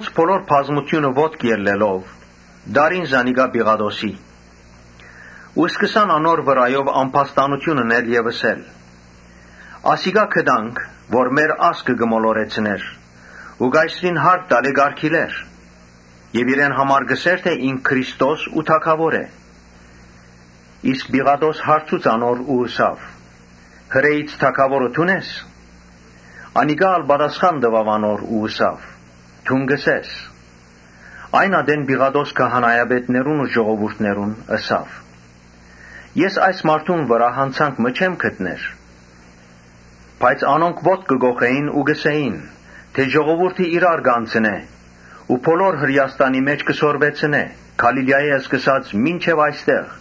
Բոլոր բազմութիւնը ոտքի ելլելով՝ տարին զանիկա Պիղատոսին Ու սկսան անոր վրայով ամբաստանութիւն ընել եւ ըսել. «Ասիկա գտանք, որ մեր ազգը կը մոլորեցնէր ու Կայսրին հարկ տալէ կ’արգիլէր եւ իրեն համար կ’ըսէր թէ ինք Քրիստոս ու թագաւոր է»։ Պիղատոս հարցուց անոր ու ըսաւ. «Հրէից թագաւորը դո՞ւն ես»։ Անիկա ալ պատասխան տուաւ ու ըսաւ անոր. «Դուն կ’ըսես»։ Այն ատեն Պիղատոս քահանայապետներուն ու ժողովուրդին ըսաւ. «Ես այս մարդուն վրայ յանցանք մը չեմ գտներ»։ Բայց անոնք ոտք կը կոխէին ու կ’ըսէին թէ՝ «Ժողովուրդը իրար կ’անցնէ ու բոլոր Հրէաստանի մէջ կը սորվեցնէ՝ Գալիլիայէն սկսած մինչեւ այստեղ»։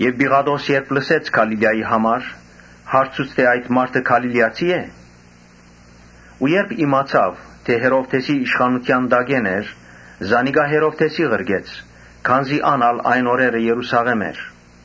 Պիղատոս երբ լսեց Գալիլիայի համար, հարցուց թէ այդ մարդը Գալիլիացի՞ է։ Երբ իմացաւ թէ Հերովդէսին իշխանութեան տակէն է, զանիկա Հերովդէսին ղրկեց, քանզի ան ալ այն օրերը Երուսաղէմ էր։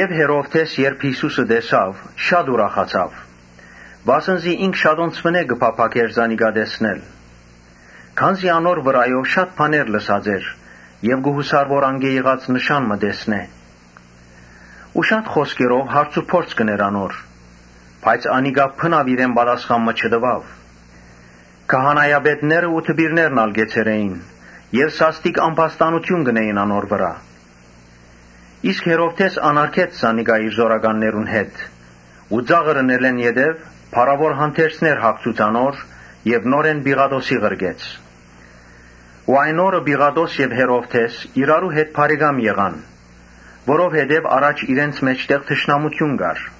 Հերովդէս երբ Յիսուսը տեսաւ շատ ուրախացաւ, վասն զի ինք շատոնց կը փափաքէր զանիկա տեսնել. քանզի անոր վրայով շատ բաներ լսած էր եւ կը յուսար անկէ նշան մը տեսնել։ Ու շատ խօսքերով հարցուփորձ ըրաւ, բայց անիկա բնաւ պատասխան մը չտուաւ։ Քահանայապետներն ու դպիրներն ալ կեցեր էին եւ սաստիկ ամբաստանութիւն կ’ընէին անոր վրայ։ Հերովդէս անարգեց զանիկա իր զօրականներուն հետ ու ծաղր ընելէն յետոյ փառաւոր հանդերձներ հագցուց անոր եւ նորէն Պիղատոսին ղրկեց։ Այն օրը Պիղատոս եւ Հերովդէս իրարու հետ բարեկամ եղան, որովհետեւ առաջ իրենց մէջտեղ թշնամութիւն կար։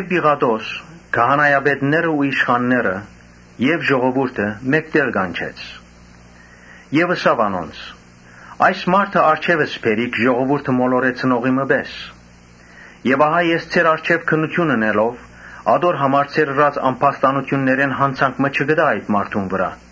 Պիղատոս քահանայապետներն ու իշխանները եւ ժողովուրդը մէկտեղ կանչեց Եւ ըսաւ անոնց. «Այս մարդը առջեւս բերիք ժողովուրդը մոլորեցնողի մը պէս, բայց ես ձեր առջեւ քննութիւն ընելով՝ ատոր համար ձեր ըրած ամբաստանութիւններէն յանցանք մը չգտայ այդ մարդուն վրայ.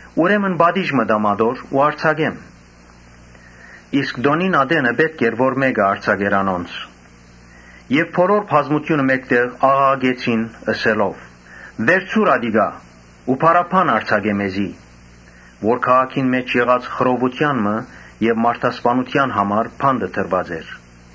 Ուրեմն պատիժ մը տամ անոր ու արձակեմ»։ (Իսկ տօնին ատենը պէտք էր որ մէկը արձակէր անոնց.) Բոլոր բազմութիւնը մէկտեղ աղաղակեցին՝ ըսելով. «Վերցուր ատիկա ու Բարաբբան արձակէ մեզի», (Որ քաղաքին մէջ եղած խռովութեան մը եւ մարդասպանութեան համար բանտը դրուած էր։)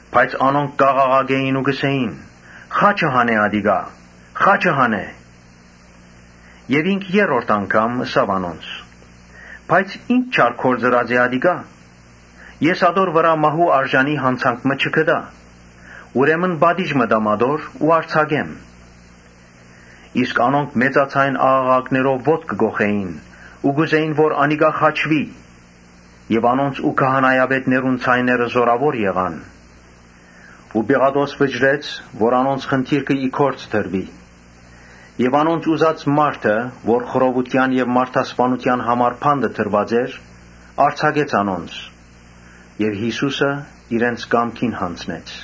Բայց անոնք կ’աղաղակէին ու կ’ըսէին. «Խա՛չը հանէ ատիկա, խաչը հանէ»։ Ինք երրորդ անգամ ըսաւ անոնց. «Բայց ի՞նչ չար գործ ըրած է ատիկա. ես ատոր վրայ մահու արժանի յանցանք մը չգտայ. ուրեմն պատիժ մը տամ ատոր ու արձակեմ»։ Իսկ անոնք մեծաձայն աղաղակներով ոտք կը կոխէին ու կ’ուզէին որ անիկա խաչուի. եւ անոնց ու քահանայապետներուն ձայները զօրաւոր եղան։ Ու Պիղատոս վճռեց որ անոնց խնդիրքը գործադրուի։ Եւ անոնց ուզած մարդը, որ խռովութեան եւ մարդասպանութեան համար բանտը դրուած էր, արձակեց անոնց եւ Յիսուսը իրենց կամքին յանձնեց։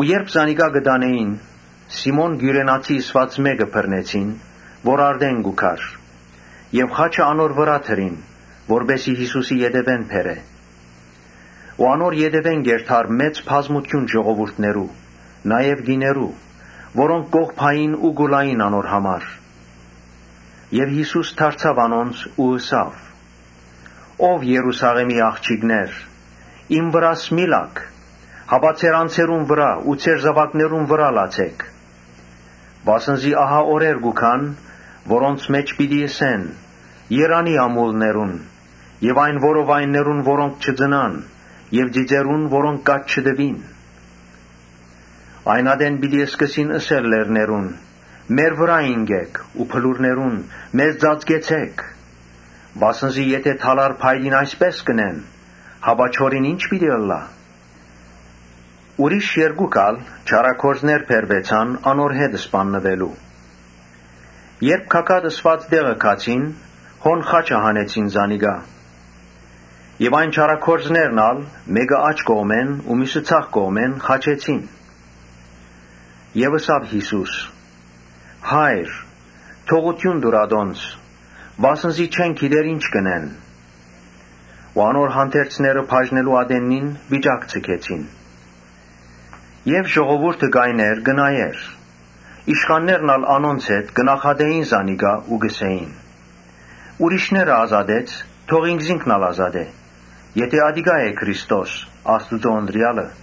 Երբ զանիկա կը տանէին, Սիմոն Կիւրենացի ըսուած մէկը բռնեցին, որ արտէն կու գար եւ խաչը անոր վրայ դրին, որպէս զի Յիսուսին ետեւէն տանի։ Անոր ետեւէն կ’երթար ժողովուրդը մեծ բազմութեամբ, նաեւ կիներ, որոնք կ’ողբային ու կու լային անոր ետեւէն։ Յիսուս դարձաւ անոնց ու ըսաւ. «Ո՛վ Երուսաղէմի աղջիկներ, իմ վրաս մի՛ լաք, հապա ձեր անձերուն վրայ ու ձեր զաւակներուն վրայ լացէք։ Վասն զի ահա օրեր պիտի գան, որոնց մէջ պիտի ըսեն. ‘Երանի՜ ամուլներուն եւ այն որովայններուն որոնք չծնան եւ ծիծերուն՝ որոնք կաթ չտուին’։ Այն ատեն պիտի սկսին ըսել լեռներուն. ‘Մեր վրայ ինկէք’ ու բլուրներուն՝ ‘Մեզ ծածկեցէք’։ Վասն զի եթէ դալար փայտին այսպէս կ’ընեն, հապա չորին ի՞նչ պիտի ընեն»։ Ուրիշ երկու հոգի ալ՝ չարագործներ՝ բերուեցան անոր հետ սպաննուելու։ Երբ Գագաթ ըսուած տեղը հասան, հոն խաչը հանեցին զանիկա եւ այն չարագործներն ալ, մէկը աջ կողմը ու միւսը ձախ կողմը խաչեցին։ Յիսուս ըսաւ. «Հա՛յր, թողութիւն տուր ատոնց, վասն զի չեն գիտեր թէ ի՛նչ կ’ընեն»։ Ու անոր հանդերձները բաժնելու ատեննին վիճակ ձգեցին։ Եւ ժողովուրդը կայներ կը նայէր. իշխաններն ալ անոնց հետ կը նախատէին զանիկա ու կ’ըսէին. «Ուրիշները ազատեց, թող ինքզինք ալ ազատէ, եթէ ատիկա է Քրիստոսը, Աստուծոյ ընտրեալը»։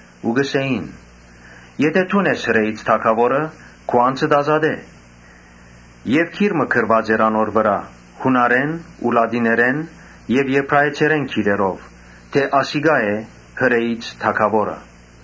Ու կ’ըսէին. «Եթէ դուն ես Հրէից թագաւորը, քու անձդ ազատէ»։ Ուր գիր մը գրուած էր Յունարէն, Լատիներէն եւ Եբրայեցերէն գրերով, թէ ‘Ասիկա է Հրէից թագաւորը’։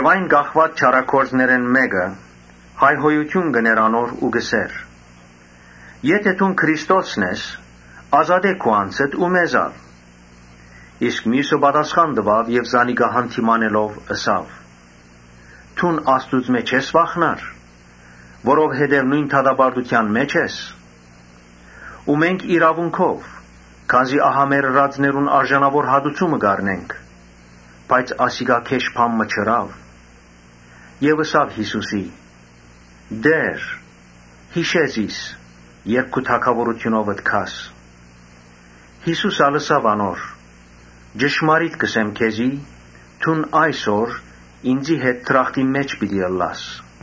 Այն կախուած չարագործներէն մէկը հայհոյութիւն կ’ընէր անոր ու կ’ըսէր. «Եթէ դուն Քրիստոսն ես, ազատէ քու անձդ ու մեզ ալ»։ Իսկ միւսը զանիկա յանդիմանելով՝ ըսաւ. «Դուն Աստուծմէ չե՞ս վախնար, որովհետեւ նոյն դատապարտութեան մէջ ես։ Մենք իրաւունքով, քանզի ահա մեր ըրածներուն արժանաւոր հատուցումը կ’առնենք. բայց ասիկա գէշ բան մը չըրաւ»։ Եւ ըսաւ Յիսուսին. «Տէ՛ր, յիշէ՛ զիս, երբ քու թագաւորութիւնովդ գաս»։ Յիսուս ալ ըսաւ անոր. «Ճշմարիտ կ’ըսեմ քեզի, ‘Դուն այսօր ինծի հետ դրախտին մէջ պիտի ըլլաս’»։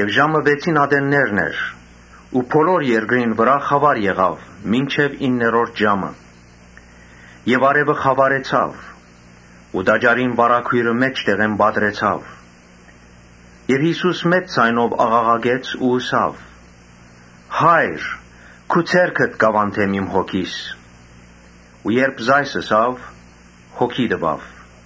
Ժամը վեցին ատեններն էր ու բոլոր երկրին վրայ խաւար եղաւ մինչեւ իններորդ ժամը։ Արեւը խաւարեցաւ Ու տաճարին վարագոյրը մէջտեղէն պատռուեցաւ։ Յիսուս մեծ ձայնով աղաղակեց ու ըսաւ. «Հա՛յր, քու ձեռքդ կ’աւանդեմ իմ հոգիս»։ Ու երբ այս ըսաւ, հոգին տուաւ։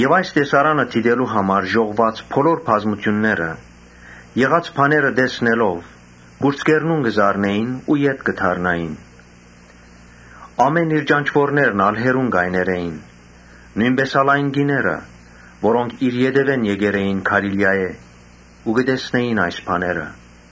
Այս տեսարանը դիտելու համար ժողվուած բազմութիւնը եղած բաները տեսնելով կուրծքերնուն կը զարնէին ու ետ կը դառնային։ Իր բոլոր ճանչուորներն ալ հեռուն կայներ էին, նոյնպէս ալ կիները՝ որոնք իր ետեւէն եկեր էին Գալիլիայէն ու կը տեսնէին այս բաները։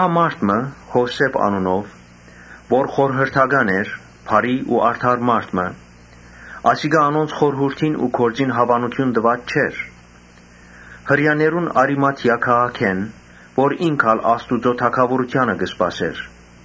Մարդ մը՝ Յովսէփ անունով, որ խորհրդական էր, բարի ու արդար մարդ մը, (Ասիկա անոնց խորհուրդին ու գործին հաւանութիւն տուած չէր,) Հրեաներուն Արիմաթիա քաղաքէն, որ ինք ալ Աստուծոյ թագաւորութեանը կ’սպասէր։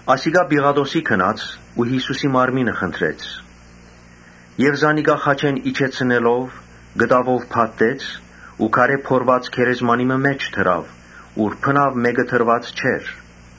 Ասիկա Պիղատոսին գնաց ու Յիսուսին մարմինը խնդրեց։ Եւ զանիկա խաչէն իջեցնելով՝ կտաւով փաթթեց ու քարէ փորուած գերեզմանի մը մէջ դրաւ, ուր բնաւ մէկը դրուած չէր։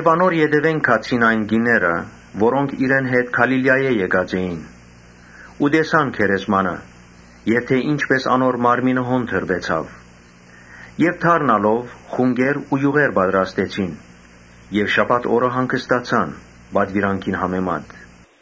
Անոր ետեւէն գացին այն կիները, որոնք իրեն հետ Գալիլիայէն եկած էին ու տեսան գերեզմանը, թէ ի՛նչպէս անոր մարմինը հոն դրուեցաւ։ Եւ դառնալով՝ խունկեր ու իւղեր պատրաստեցին եւ շաբաթ օրը հանգստացան պատուիրանքին համեմատ։